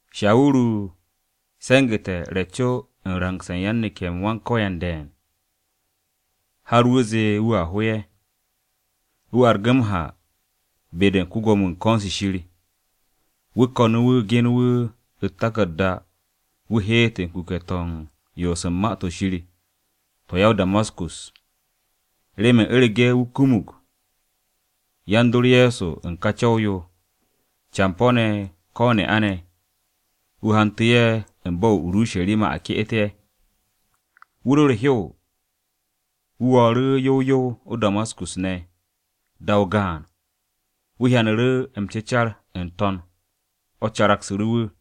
Shawuru se̱ngu̱te̱ re̱ co u̱n rangse̱ u̱n yan-neke̱-m Wan-Ko̱yan de̱e̱n, har m-ze̱e̱ wu̱a ho ye̱. Wu̱ argu̱ m-ha be-de u̱n ko-Gwo̱mo-wu̱ u̱n ko̱n-se Shir. Wu̱ ko̱nu̱ wu̱ genu̱ wu̱ u̱t-taku̱rda wu̱ heet u̱n kuke̱-to̱ u̱n yoos u̱n Ma-to̱ Shir to̱ ya-o-Damaskus, remen u̱rege̱ wu̱ kumug yan-dor Ye̱so u̱n Ka Co̱w-yo, campo̱-ne̱ ko̱ ne'a-ne̱, wu̱ hantu̱ ye̱ u̱n bo̱-o̱ o-Urusharima a ke'et ye̱. Wu̱ ro̱ u̱r-hew, wu̱ wo̱o̱ru̱ yow yow o-Damaskus ne̱. Da-o gaan, wu̱ hyanu̱ru̱ m-cecar n-to̱n mo̱ caragsu̱ru̱ u̱n wu̱.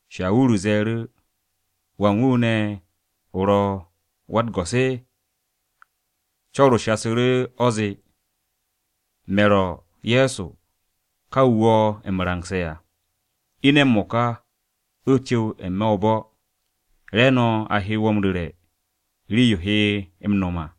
Shawuru ze̱e̱ru̱, “¿Wan wu̱ ne̱ o ro̱ Wa-u̱t-Go̱s?” Co̱r-o shasu̱ru̱ o̱ zee, “Me̱ ro̱ Ye̱so ka wu̱ wo̱ m-rangse̱ à. Ine̱ m-mo̱ka, o cu̱w n-me̱ o-bo̱, re̱e̱no̱ a he wo̱ m-ru̱re̱ rii-yo o he m-no̱m à.”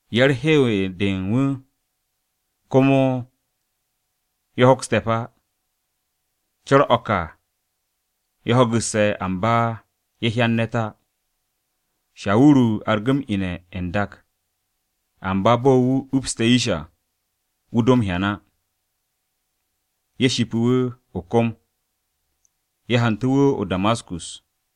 Yan-u̱r-hew de u̱n wu̱ komo ye̱ hoks te̱p á, co̱r-o̱ ka ye̱ ho̱gu̱sse̱ amba ye̱ hyan ne̱t á. Shawuru argu̱ m-ine̱ n-dak, amba bo̱ wu̱ upste̱ yish à, wu̱ do m-hyan á. Ye̱ shipu̱ wu̱ o-kom, ye̱ hantu̱ wu̱ o-Damaskus.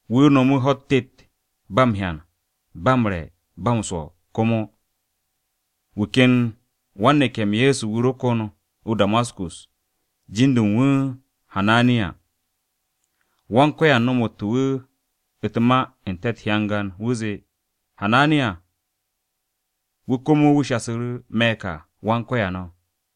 Wu̱ no̱mu̱ ho̱-u̱t tet, ba m-hyan, ba m-re̱, ba m-swo̱, komo. Wu̱ ken wan-neke̱-m Ye̱so wu̱ ro kon o-Damaskus, jin-de u̱n wu̱ Hananiya. Wan-Ko̱yan nomo wu̱ u̱t-ma n-te̱ u̱t-hyangan, wu̱ zee, “Hananiya!” Wu̱ komo wu̱ shasu̱ru̱, “Me̱ ka, Wan-Ko̱yan o̱.”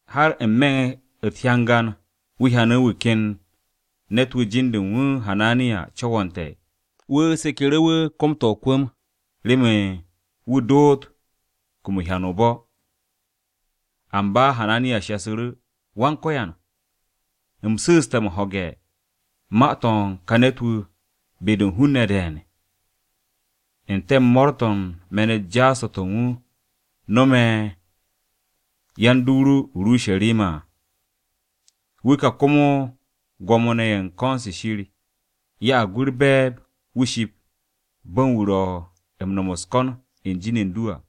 Har n-me̱ u̱t-hyangan wu̱ hyanu̱ wu̱ ken ne̱t-wu̱ jin-de u̱n wu̱ Hananiya co̱wo̱nte̱, wu̱ seku̱ru̱ wu̱ kom-to̱ o-kwu̱m remen wu̱ doot kumun hyan-o̱ o-bo̱.” Amba Hananiya shasu̱ru̱, “Wan-Ko̱yan, u̱m su̱u̱ste̱ ho̱ge̱ u̱n ma-to̱ u̱n ka ne̱t-wu̱ be-de u̱n hun-ne̱ de̱e̱n, n-te̱ u̱n mo̱o̱r-to̱ u̱n me̱n-u̱t jaas-to̱ to̱ wu̱ nome̱ yan-dor ru o-Urusharima à. Wu̱ ka komo Gwo̱mo-ne̱ ye̱ u̱n ko̱n-se Shir ya'ag wu̱ u̱r-be̱e̱b wu̱ ship u̱n bo̱ u̱n wu̱ ro̱ u̱n no̱m u̱s-ko̱n u̱n jin u̱n du à.”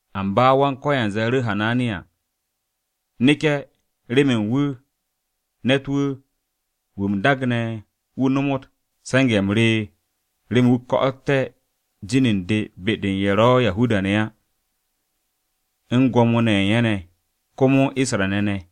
Amba Wan-Ko̱yan ze̱e̱ru̱ Hananiya, “Neke̱ remen wu̱ ne̱t-wu̱, wu̱ u̱m daagne̱ wu̱ nomot se̱nge̱-m re remen wu̱ ko̱'o̱tté̱ jin u̱n de be-de u̱n ye̱ ro̱ Yahuda-ne̱ á, u̱n gwo̱mo-ne̱ u̱n ye̱ ne̱, komo u̱n Isra-ne̱ ne̱.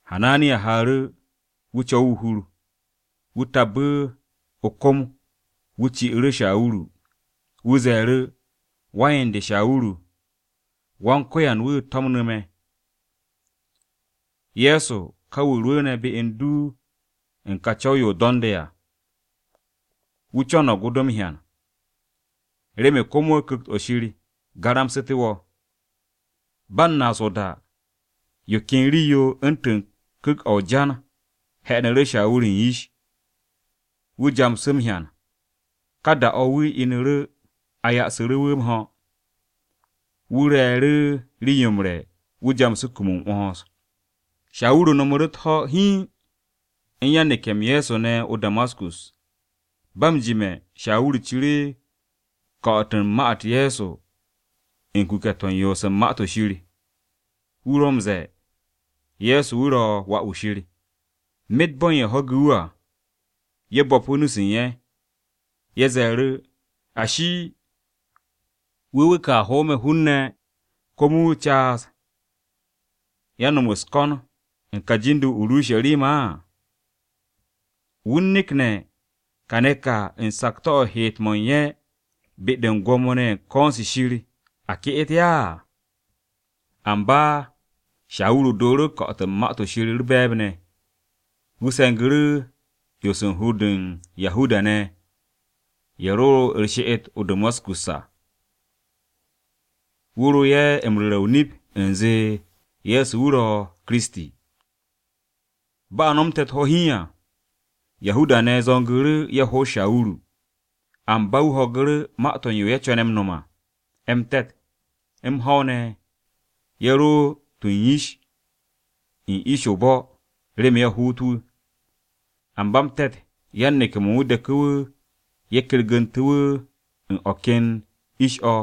Hananiya haaru̱, wu̱ co̱wu̱ o-hur. Wu̱ tabbu̱ o-kom wu̱ ci'u̱ru̱ Shawuru. Wu̱ ze̱e̱ru̱, “Wan-yen de Shawuru, Wan-Ko̱yan wu̱ to̱mnu̱ me̱. Ye̱so ka wu̱ rwu̱u̱ne̱ be u̱n du u̱n ka co̱w-yo o do̱nde̱ à. Wu̱ co̱no̱g o do m-hyan, remen komo Ku̱kt-o̱ Shir garamsu̱té̱ wo̱.” Ba u̱n naas o-da, yo ken rii-yo u̱ntu̱n ku̱k-o̱ o-jan he̱'e̱nu̱ru̱ Shawuru u̱n yish, wu̱ jamsu̱ m-hyan. Ka da-o̱ wu̱ inu̱ru̱ a yo'osu̱ru̱ wu̱ m-ho̱. Wu̱ re̱e̱ru̱ rii-yo m-re̱ wu̱ jamsu̱ kum m-'wo̱ns. Shawuru no̱mu̱ru̱ u̱t-ho̱ hiin u̱n yan-neke̱-m Ye̱so ne̱ o-Damaskus. Ba m-jime̱, Shawuru ciru̱ ko̱'o̱t u̱n ma-u̱t Ye̱so u̱n kuke̱-to̱ u̱n yoos u̱n Ma-to̱ Shir. Wu̱ ro m-ze̱e̱ Ye̱so wu̱ ro̱ Wà-wu̱ Shir. Myet bo̱n ye̱ ho̱gu̱ wu̱ à, ye̱ bo̱pu̱ nu-se u̱n ye̱. Ye̱ ze̱e̱ru̱, “Ashi, ¿wu̱ wu̱ ka hoome̱ hun-ne̱ komo wu̱ caas yan-no̱m u̱s-ko̱n u̱n ka jin-de o-Urusharima á? ¿Wu̱ u̱n nekne̱ kane̱ ka u̱n sakto̱-o̱ u̱n heet-mo̱ u̱n ye̱ be-de u̱n Gwo̱mo-ne̱ ye̱ u̱n ko̱n-se Shir a ke'et ye̱ á?” Amba Shawuru do̱o̱ru̱ ko̱'o̱t u̱n Ma-to̱ Shir u̱r-be̱e̱b ne̱. Wu̱ se̱ngu̱ru̱ 'yons u̱n hur-de u̱n Yahuda-ne̱ ye̱ ro u̱r-she'et o-Damaskus à, wu̱ ro ye̱ m-ru̱re̱ o-nip u̱nze Ye̱so wu̱ ro̱ Kiristi. Bo̱ a nomte̱ u̱t-ho̱ hiin à, Yahuda-ne̱ zo̱ngu̱ru̱ ye̱ hoot Shawuru. Amba wu̱ ho̱gu̱ru̱ ma-to̱ u̱n yo ye̱ co̱ne̱ m-no̱m à. M-te̱t, m-ho̱w ne̱ ye̱ ro u̱n tu u̱n yish u̱n ish-se o-bo̱ remen ye̱ hoot wu̱. Amba m-te̱t yan-neke̱-mo̱ u̱n wu̱ deku̱ wu̱, ye̱ kergu̱ntu̱ wu̱ u̱n o̱ ken ish-o̱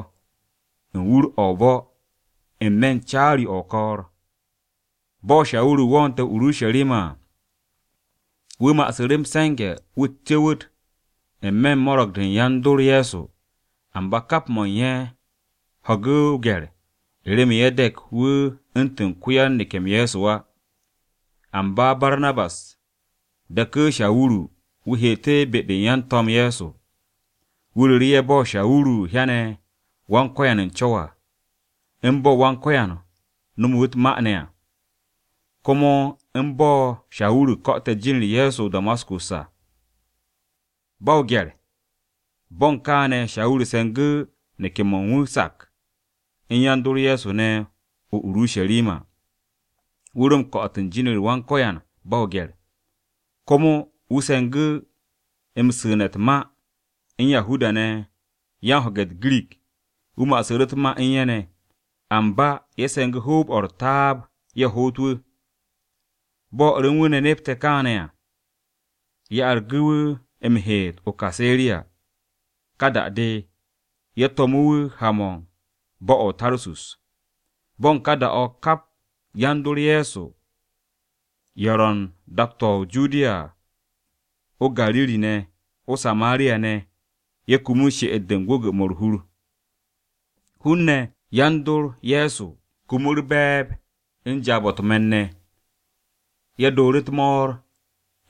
u̱n wur-o̱ u̱n o-bo̱ n-me̱ u̱n caari-o̱ o-ko̱o̱r. Bo̱ Shawuru wo̱o̱nte̱ o-Urusharima à, wu̱ ma'asu̱ru̱ m-se̱nge̱ wu̱ cu̱wu̱t n-me̱ u̱n mo̱rge̱-de u̱n yan-dor Ye̱so, amba kap mo̱ u̱n ye̱ ho̱gu̱ o-gye̱r u̱n remen ye̱ de̱k wu̱ u̱ntu̱n ko-yan-neke̱-m Ye̱so á. Amba Barnabas deku̱ Shawuru wu̱ heet be-de u̱n yan-To̱m Ye̱so. Wu̱ ru̱ru̱ ye̱ bo̱ Shawuru hyane̱ Wan-Ko̱yan u̱n co̱w à, u̱n bo̱ Wan-Ko̱yan nomo wu̱ u̱t-ma ne̱ à, komo u̱n bo̱ Shawuru ko̱'o̱te̱ jin-u̱r Ye̱so o-Damaskus à, ba o-gye̱r. Bo̱ u̱n kane̱, Shawuru se̱ngu̱ neke̱-mo̱ u̱n wu̱ sak u̱n yan-dor Ye̱so ne̱ o-Urusharima. Wu̱ ro m-ko̱'o̱t u̱n jin-u̱r Wan-Ko̱yan ba o-gye̱r. Komo ma-u̱t se̱ngu̱ wu̱ m-su̱u̱ne̱ u̱n Yahuda-ne̱ yan-ho̱ge̱ u̱t-Girik, wu̱ ma'asu̱ru̱ u̱t-ma u̱n ye̱ ne̱, amba ye̱ se̱ngu̱ hoob-o̱ u̱r-taab ye̱ hoot wu̱. Bo̱ o̱r u̱n wu̱ ne̱ nepte̱ kaane̱ à, ye̱ argu̱ wu̱ m-heet o-Kaseriya. Ka da-de, ye̱ to̱mu̱ wu̱ ha-mo̱ u̱n bo̱-o̱ o-Tarsus. Bo̱ u̱n ka da-o̱ hun-ne̱ kap yan-dor Ye̱so ye̱ ro̱ u̱n dak-to̱ o-Judiya à, o-Gariri ne̱, o-Samariya ne̱, ye̱ kumu she'et-de u̱n gwu̱gwu̱-mo̱ u̱r-hur. Hun-ne̱ yan-dor Ye̱so kumu u̱r-be̱e̱b, u̱n jaab-o̱ u̱t-me̱n ne̱, ye̱ do̱o̱ru̱ u̱t-mo̱o̱r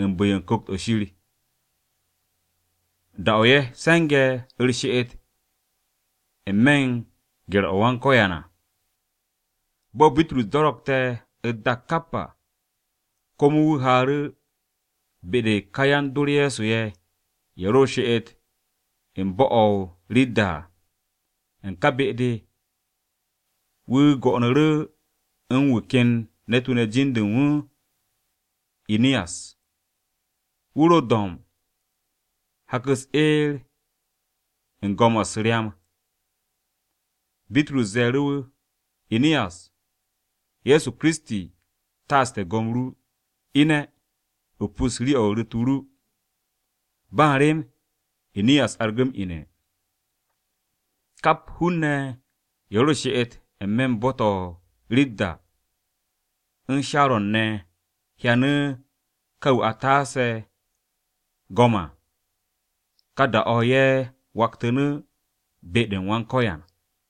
u̱n bu̱-yo u̱n Ku̱kt-o̱ Shir, da-o̱ ye̱ se̱nge̱ u̱r-she'et n-me̱ u̱n gye̱r-o Wan-Ko̱yan à. Bo̱ Bitrus do̱ro̱kte̱ u̱t-dak kap à, komo wu̱ haaru̱ be-de u̱n ka yan-dor Ye̱so ye̱, ye̱ ro u̱r-she'et u̱n bo̱-o̱ o-Ridda à. U̱n ka be-de, wu̱ go̱'o̱nu̱ru̱ u̱n wu̱ ken ne̱t-wu̱ ne̱ jin-de u̱n wu̱ Iniyas, wu̱ ro do̱mb hak-u̱s eer u̱n go̱m-o̱ u̱s-ryam. Bitrus ze̱e̱ru̱ wu̱, “Iniyas, Ye̱so Kiristi taaste̱ go̱m ru. Ine̱, o pus rii-o̱ u̱r-ru̱t o ru.” Ba u̱n rem, Iniyas argu̱ m-ine̱. Kap hun-ne̱ ye̱ ro u̱r-she'et n-me̱ u̱n bo̱-to̱ o-Ridda u̱n Sharo̱n ne̱ hyanu̱ ka wu̱ a taase̱ go̱m à. Ka da-o̱ ye̱ waktu̱nu̱ be-u̱r Wan-Ko̱yan.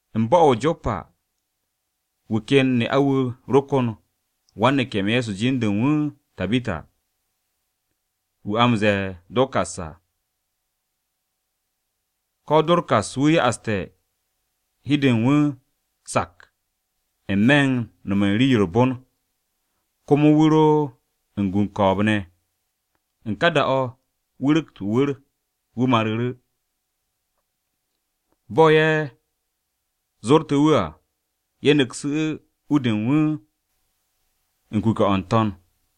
U̱n bo̱-o̱ o-Jopa, wu̱ ken ne'a-wu̱ ro kon wan-neke̱-m Ye̱so jin-de u̱n wu̱ Tabita, wu̱ a m-ze̱e̱ Dorkas à. Ka Dorkas wu̱ ya'aste̱ hi u̱n de u̱n wu̱ sak n-me̱ u̱n no̱m u̱n rii-yo u̱r-bon, komo wu̱ ro u̱n gu u̱n ko̱o̱b-ne̱. U̱n ká da-o̱, wu̱ ru̱kt o-wu̱r, wu̱ maru̱ru̱. Bo̱ ye̱ zorte̱ wu̱ à, ye̱ ne̱ksu̱ u-de u̱n wu̱ u̱n kuke̱-o̱ n-to̱n.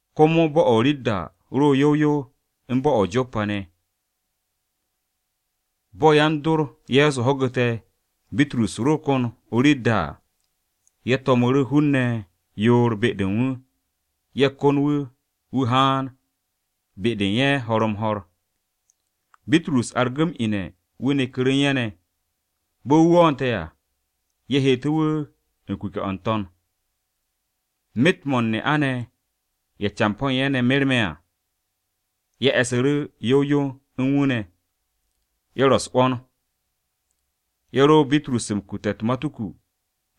Komo bo̱-o̱ o-Ridda ro̱ yow yow u̱n bo̱-o̱ o-Jopa ne̱. Bo̱ yan-dor Ye̱so ho̱gu̱te̱ Bitrus ro kon o-Ridda à, ye̱ to̱mu̱ru̱ hun-ne̱ yoor be-de u̱n wu̱, ye̱ kon wu̱ wu̱ haan be-de u̱n ye̱ ho̱r-m-ho̱r. Bitrus argu̱ m-ine̱ wu̱ neku̱ru̱ u̱n ye̱ ne̱. Bo̱ wu̱ wo̱o̱nte̱ à, ye̱ heetu̱ wu̱ u̱n kuke̱-o̱ n-to̱n. Myet-mo̱ u̱n ne'a-ne̱ ye̱ campo̱ u̱n ye̱ ne̱ merme̱ à, ye̱ e̱su̱ru̱ yow yow u̱n wu̱ ne̱, ye̱ ro u̱s-'wo̱n, ye̱ ro Bitrus m-kute̱ u̱t-matuku,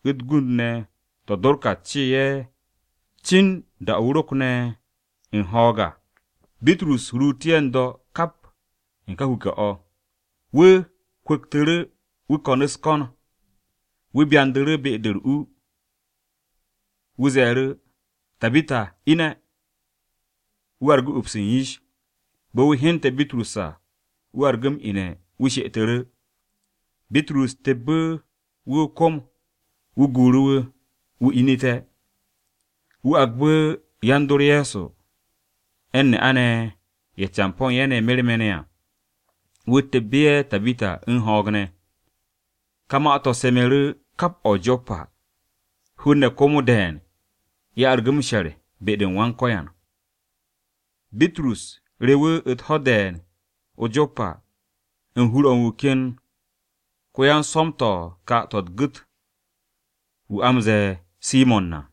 u̱t-gund ne̱ to̱ Dorkas cee ye̱ cin da-o̱ wu̱ rokne̱ u̱n ho̱o̱g à. Bitrus ruutu̱ ye̱ n-do̱ kap u̱n ka kuke̱-o̱, wu̱ kwu̱ktu̱ru̱ wu̱ ko̱n u̱s-ko̱n. Wu̱ byandu̱ru̱ be-de u̱r-u, wu̱ ze̱e̱ru̱, “Tabita, ine̱.” Wu̱ argu̱ ups u̱n yish. Bo̱ wu̱ hyente̱ Bitrus à, wu̱ argu̱ m-ine̱ wu̱ she'etu̱ru̱. Bitrus tebbu̱ wu̱ o-kom wu̱ guuru̱ wu̱, wu̱ inu̱te̱. Wu̱ agbu̱ yan-dor Ye̱so, u̱n ne'a-ne̱ ye̱ campo̱ u̱n ye̱ ne̱ merme̱ ne̱ à, wu̱ tebbu̱ ye̱ Tabita u̱n ho̱o̱g ne̱. Ka ma-to̱ semu̱ru̱ kap o̱ o-Jopa, hun-ne̱ komo de̱e̱n ye̱ argu̱ m-she̱r be-u̱r Wan-Ko̱yan. Bitrus rewu̱ u̱t-ho̱ de̱e̱n o-Jopa, u̱n hur-o̱ u̱n wu̱ ken ko-yan-swo̱m-to̱ u̱t-ka to̱ u̱t-gu̱t wu̱, wu̱ a m-ze̱e̱ Simo̱n à.